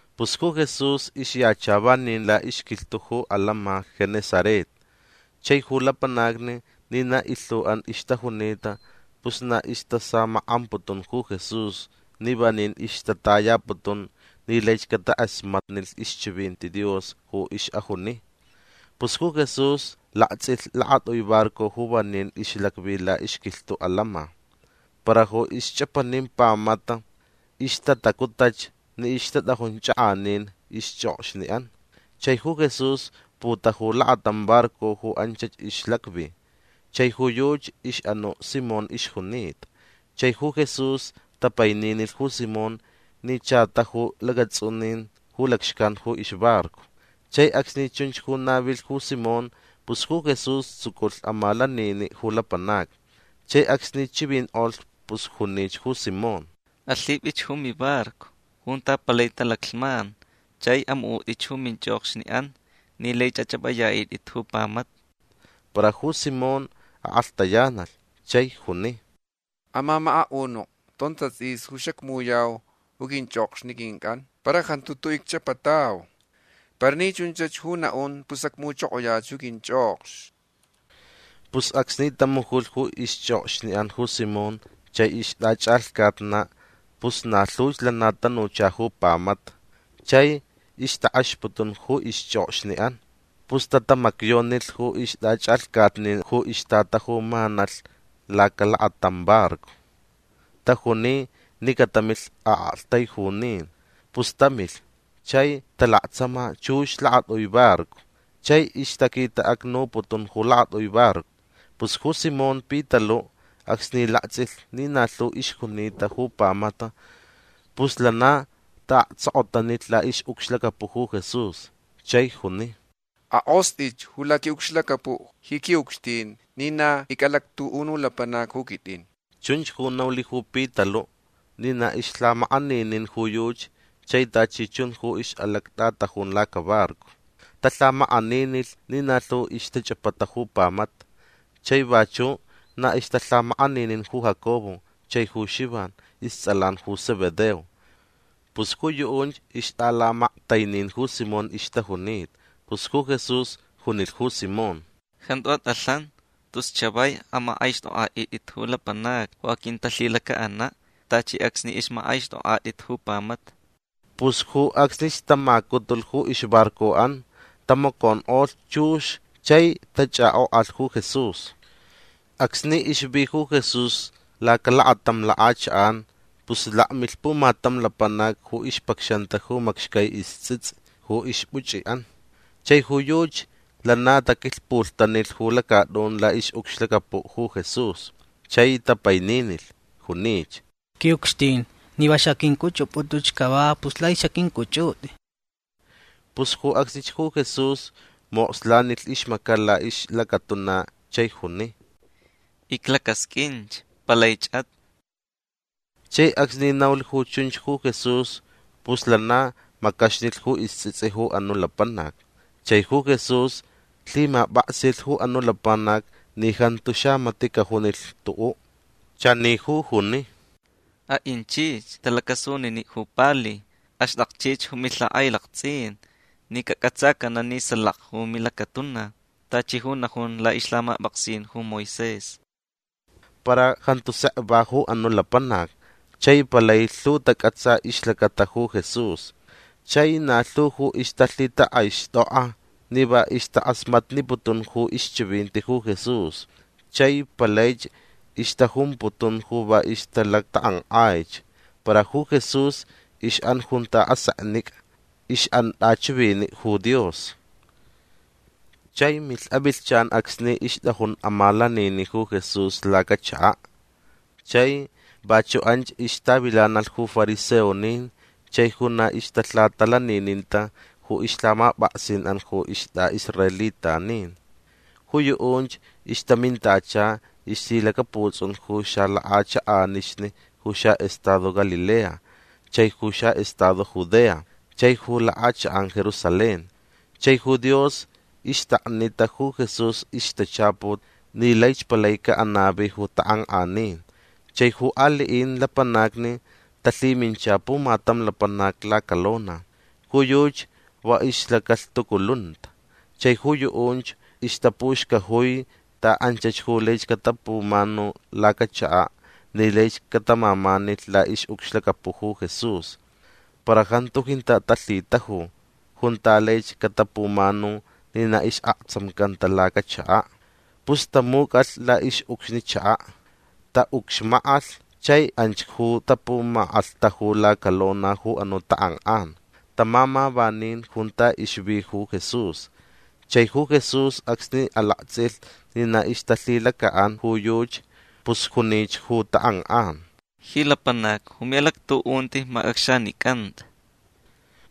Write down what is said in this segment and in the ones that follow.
Pus ju Jesús ixyacha vanin laʼixquilhtuʼ ju atantsʼin Genesaret. Chai ju lapanacni ni na ilhuʼan ixtajunita pus na istasamakʼamputun ju Jesús ni vanin ixtatayaputun ni laich catakʼasmatnilh ixchivinti Dios ju ixʼajuni. Pus ju Jesús laktsʼilh lakatʼui barco ju vanin ixlacvi laʼixquilhtuʼ atantsʼin. Para ju ixchʼapanin pamata ixtatacutʼach ni ixtatʼajun chakʼanin ixchʼokxniʼan. Chai ju Jesús putaju lakatam barco ju anchach ixlacvi. Chai ju yuchi ixʼanuʼ Simón ixjunita. Chai ju Jesús tapaininilh ju Simón ni cha taju lacatsʼunin ju lacxcan ju ixbarco. Chai acsni chunch ju navilh ju Simón pus ju Jesús tsuculh amalaniniʼ ju lapanacni. Chai acsni chivinkʼolh pus junich ju Simón: ―Alhipʼich ju mimbarco junta palai talaclhman chai amuʼutʼich ju minchʼokxniʼan ni lai achʼapʼayaʼitʼit ju pamata. Para ju Simón akʼalhtayanalh chai juni: ―Amamakaʼunuʼ tonta tsʼisni ju xacmujuyau ju quinchʼokxni quincʼan. Para jantu tuʼuʼ icchʼapatau. Para ni chunch ju naʼun pus acmujuchokoyach ju quinchʼokxni. Pus acsni tamujulh ju ixchʼokxniʼan ju Simón chai ixtʼachʼalhcatnaʼ pus na lhuch lana tanucha ju pamata. Chai ixtakʼexputun ju ixchʼokxniʼan. Pus tatamacyonilh ju ixtʼachʼalhcatnin ju ixtatajumanalh lacalakatam barco. Tajuni ni catamilh aʼaktaijunin. Pus tamilh chai talaktsama chux lakatʼui barco. Chai ixtaquitaʼacnuputun ju lakatʼui barco. Pus ju Simón Pitaluʼ acsni laktsʼilh ni na lhu ixjunita ju pamata pus lana taʼaktsokotanilh laʼixʼucxlacapuʼ ju Jesús chai juni: ―Akʼostʼich ju laquiʼucxlacapuʼ ji quiʼucxtin ni na icʼalactuʼunuʼ lapanac ju quitʼin. Chunch ju naulh ju Pitaluʼ ni na ixlhamakʼaninin ju yuchi chai tachi chun ju ixʼalactʼatajun lacabarco. Talhamakʼaninilh ni na lhu ixtachʼapata ju pamata. Chai vachuʼ na ixtalhamakʼaninin ju Jacobo chai ju Xivan istsʼalan ju Zebedeo. Pus ju yuʼunch ixtʼalamaktainin ju Simón ixtajunita. Pus ju Jesús junilh ju Simón: ―Jantu atʼalhan. Tus chavai amakʼaixtʼokʼaʼitʼit ju lapanacni ju aquintalhilacaʼanaʼ tachi acsni ixmakʼaixtʼokʼatʼit ju pamata. Pus ju acsnich tamacutulh ju ixbarcoʼan. Tamaconkʼolh chux chai tachʼakʼokʼalh ju Jesús. Acsni ixvi ju Jesús lacalakatam lakʼachakʼan pus lakmilh pumatam lapanac ju ixpacxanta ju macxcai istsʼitsʼi ju ixpuchʼiʼan. Chai ju yuchi lana taquilhputanilh ju lacatʼun laʼixʼucxlacapuʼ ju Jesús. Chai tapaininilh. Junich: ―Quiʼucxtin ni va xaqʼuincʼuchʼupʼutʼuch cava pus laich xaqʼuincʼuchʼutʼi. Pus ju acsnich ju Jesús mokslanilh ixmacaʼ laʼixlacatuna chai juni: ―Iclacasqʼuin. Palaichʼat. Chai acsni naulh ju chunch ju Jesús pus lana macaxnilh ju istsʼitsʼi ju anuʼ lapanac. Chai ju Jesús lhimapʼaksilh ju anuʼ lapanac ni jantu xamatiʼ cajunilh tuʼuʼ. Chani ju juni: ―Aʼinchich tʼalacʼasuniniʼ ju pali. Axtʼakchich ju milhakʼailaktsʼin ni cacʼatsacanaʼ ni salaka ju milacatuna tachi ju najun laʼixlhamapʼaksin ju Moisés. Para jantu sek va ju anuʼ lapanac chai palai lhu tacʼatsa ixlacata ju Jesús. Chai na lhu ju ixtalhitakʼaixtʼokʼa ni va ixtakʼasmatniputun ju ixchivinti ju Jesús chai palaich ixtajumputun ju va ixtalactakʼankʼaich. Para ju Jesús ixʼan junta aseknicʼa. Ixʼan tʼachiviniʼ ju Dios. Chai milh avilhchan acsni ixtʼajun amalaniniʼ ju Jesús lacachakaʼ. Chai vachuʼ anch ixtavilanalh ju fariseonin chai ju na ixtalhatalanininta ju ixlhamapʼaksinʼan ju istʼaʼisraelitanin. Ju yuʼunch ixtamintacha ixlhilacaputsʼun ju xalakʼachakʼanixni ju xaʼestado Galilea chai ju xaʼestado Judea chai ju lakʼachakʼan Jerusalén. Chai ju Dios ixtaknita ju Jesús ixtachaput ni laich palai caʼanavi ju takʼankʼanin. Chai ju aliʼin lapanacni talhimincha pumatam lapanac lacalona. Ju yuchi va ixlacalhtuculunta. Chai ju yuʼunch ixtapuxcajui ta anchach ju laich catapumanu lacachakaʼ ni laich catamamanilh laʼixʼucxlacapuʼ ju Jesús. Para jantu jintaʼ talhitaju junta laich catapumanu ni na isʼaktsamcanta lacachakaʼ. Pus tamucʼalh laʼixʼucxni chakaʼ. Taʼucxmakʼalh chai anch ju tapumakʼalhtaju lacalona ju anuʼ takʼankʼan. Tamama vanin junta ixvi ju Jesús. Chai ju Jesús acsni alaktsʼilh ni na ixtalhilacaʼan ju yuchi pus junich ju takʼankʼan: ―Ji lapanac ju miʼalactuʼunti macʼacxanicanta.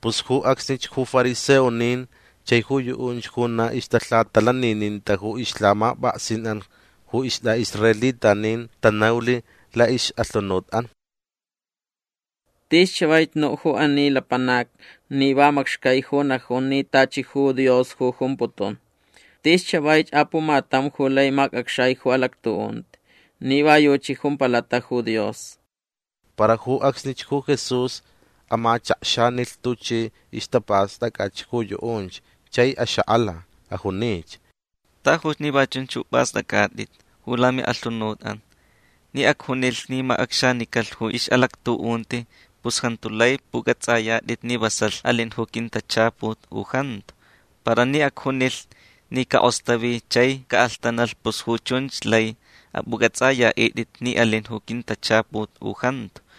Pus ju acsnich ju fariseonin chai ju yuʼunch ju na ixtalhatalanininta ju ixlhamapʼaksinʼan ju istʼaʼisraelitanin tanaulh laʼixʼalhunutʼan: “Tis chavaich nuʼ ju ani lapanac ni va macxcai ju najun ni tachi ju Dios ju jumputun. Tis chavaich apumatam ju lai macʼacxai ju alactuʼunti. Ni va yuchi jumpalaʼ ju Dios”. Para ju acsnich ju Jesús amachakxanilh tuchi ixtapastʼacʼach ju yuʼunch chai axakʼala. Ajunich: ―Tajuch ni va chunch ju pʼastʼacʼatʼit ju lamiʼalhunutʼan. Ni acjunilh ni macʼacxanicalh ju ixʼalactuʼunti pus jantu lai pʼucʼatsʼayatʼit ni vasalh alin ju quintachaput u jantu. Para ni acjunilh ni cakʼostavi chai caʼalhtanalh pus ju chunch lai apʼucʼatsʼayaʼitʼit ni alin ju quintachaput u jantu.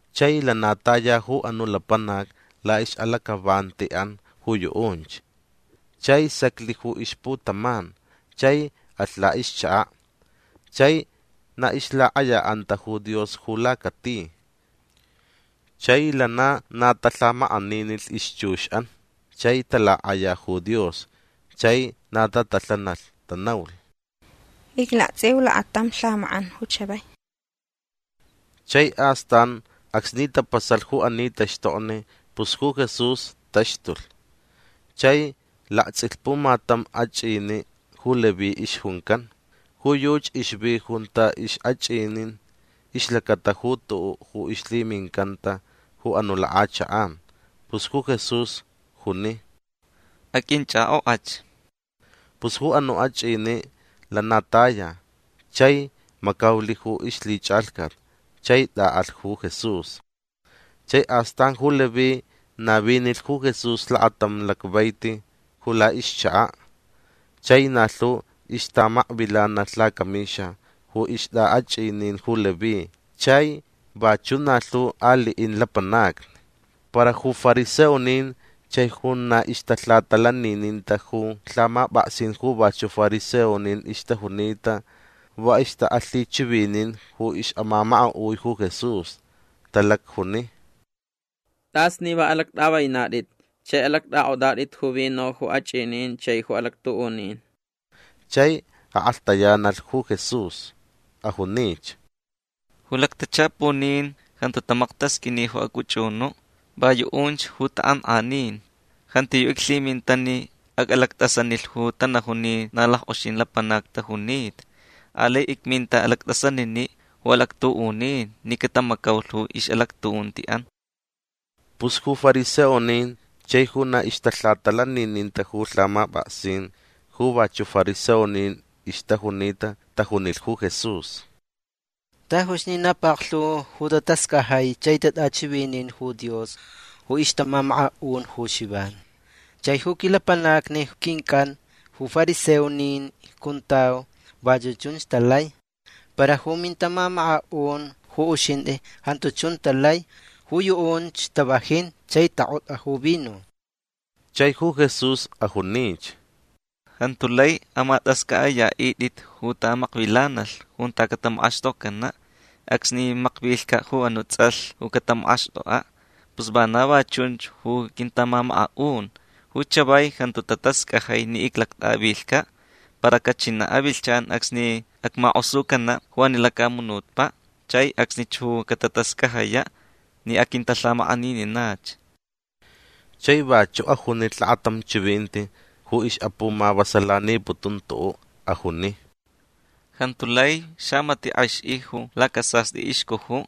Chai lana taya ju anuʼ lapanac laʼixʼalacʼavantiʼan ju yuʼunch. Chai saclh ju ixputaman. Chai alh laʼixchakaʼ. Chai na ixlakʼayaʼanta ju Dios ju lacati. Chai lana na talhamakʼaninilh ixchuxʼan. Chai talakʼaya ju Dios. Chai na tatalhanalh. Tanaulh: ―Iclaktsʼiu lakatam lhamakʼan ju chavai. Chai astan acsni tapasalh ju ani taxtokni pus ju Jesús taxtulh. Chai laktsʼilh pumatam achʼiniʼ ju Leví ixjuncan. Ju yuchi ixvi junta ixʼachʼinin ixlacata ju tuʼuʼ ju ixlhimincanta ju anuʼ lakʼachakʼan. Pus ju Jesús juni: ―Aqʼuinchʼakʼokʼach. Pus ju anuʼ achʼiniʼ lana taya chai macaulh ju ixlhichʼalhcat chai tʼaʼalh ju Jesús. Chai astan ju Leví navinilh ju Jesús lakatam lacvaiti ju laʼixchakaʼ. Chai na lhu ixtamakvilanalh lacamixa ju ixtʼaʼachʼinin ju Leví chai vachuʼ na lhu aliʼin lapanacni. Para ju fariseonin chai ju na ixtalhatalanininta ju lhamapʼaksin ju vachuʼ fariseonin ixtajunita va ixtaʼalhichivinin ju ixʼamamakaʼui ju Jesús. Talacjuni: ―Tʼas ni va alactʼavainatʼit chai alactʼakʼotʼatʼit ju vino ju achʼinin chai ju alactuʼunin. Chai akʼalhtayanalh ju Jesús. Ajunich: ―Ju lactachapunin jantu tamaktasqʼuini ju acʼuchʼunuʼ. Va yuʼunch ju takʼankʼanin. Jantiyuʼ iclhiminta ni acʼalactʼasanilh ju tanajun ni na lackʼoxin lapanacni tajunita. Alai icminta alactʼasaniniʼ ju alactuʼunin ni catamacaulh ju ixʼalactuʼuntiʼan. Pus ju fariseonin chai ju na ixtalhatalanininta ju lhamapʼaksin ju vachuʼ fariseonin ixtajunita tajunilh ju Jesús: ―Tajuch ni na paklhu ju tatascajai chai tatʼachivinin ju Dios ju ixtamamakaʼun ju Xivan. Chai ju quilapanacni quincʼan ju fariseonin icjuntau vachuʼ chunch talai. Para ju mintamamakaʼun ju uxintʼi jantu chunch talai. Ju yuʼunch tavajin chai takʼotʼa ju vino. Chai ju Jesús ajunich: ―Jantu lai amatʼascʼaʼayaʼitʼit ju tamakvilanalh junta catamakʼaxtokcanaʼ acsni makvilhcaʼ ju anuʼ tsʼalh ju catamakʼaxtʼokʼaʼ. Pus vana va chunch ju quintamamakaʼun. Ju chavai jantu tatascajai ni icʼalactʼavilhcaʼ. Para cachinaʼ avilhchan acsni acmakʼosucanaʼ ju ani lacamunutpaʼ. Chai acsnich ju catatascajayaʼ ni aquintalhamakʼanininach. Chai vachuʼ ajunilh lakatam chivinti ju ixʼapumavasalaniputun tuʼuʼ. Ajuni: ―Jantu lai xamatiʼ kʼexʼi ju lacasastʼi ixcujuʼ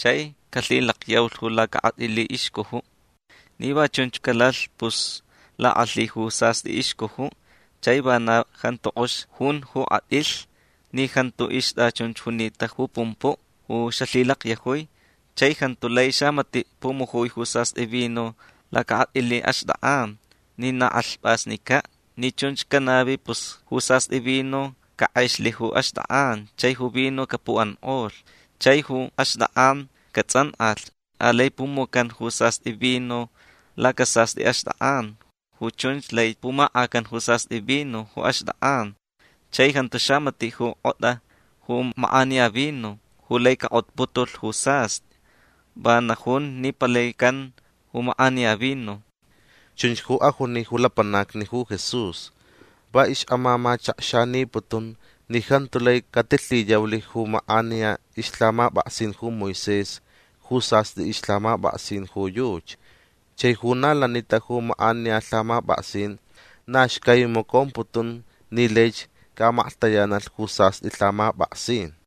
chai calhilakyaulh ju lacakʼatʼili ixcujuʼ. Ni va chunch calalh pus lakʼalhi ju sastʼi ixcujuʼ chai va na jantu kʼox jun ju kʼatʼilh ni jantu ixtʼachunch junita ju pumpuʼ ju xalhilakyajui. Chai jantu lai xamatiʼ pumujui ju sastʼi vino lacakʼatʼili axtʼakʼan ni na kʼalhpʼasnicaʼ. Ni chunch canavi pus ju sastʼi vino cakʼexlh ju axtʼakʼan chai ju vino capukʼankʼolh. Chai ju axtʼakʼan catsʼankʼalh. Alai pumucan ju sastʼi vino lacasastʼi axtʼakʼan. Ju chunch lai pumakʼacan ju sastʼi vino ju axtʼakʼan. Chai jantu xamatiʼ ju kʼotʼa ju makʼaniya vino ju lai cakʼotputulh ju sastʼi. Va najun ni palai can ju makʼaniya vino. Chunch ju ajuni ju lapanacni ju Jesús. Va ixʼamamachakxaniputun ni jantu lai catilhiyaulh ju makʼaniya ixlhamapʼaksin ju Moisés ju sastʼi ixlhamapʼaksin ju yuchi. Chai ju na lanita ju makʼaniya lhamapʼaksin na xcai macomputun ni laich caʼamaklhtayanalh ju sastʼi lhamapʼaksin.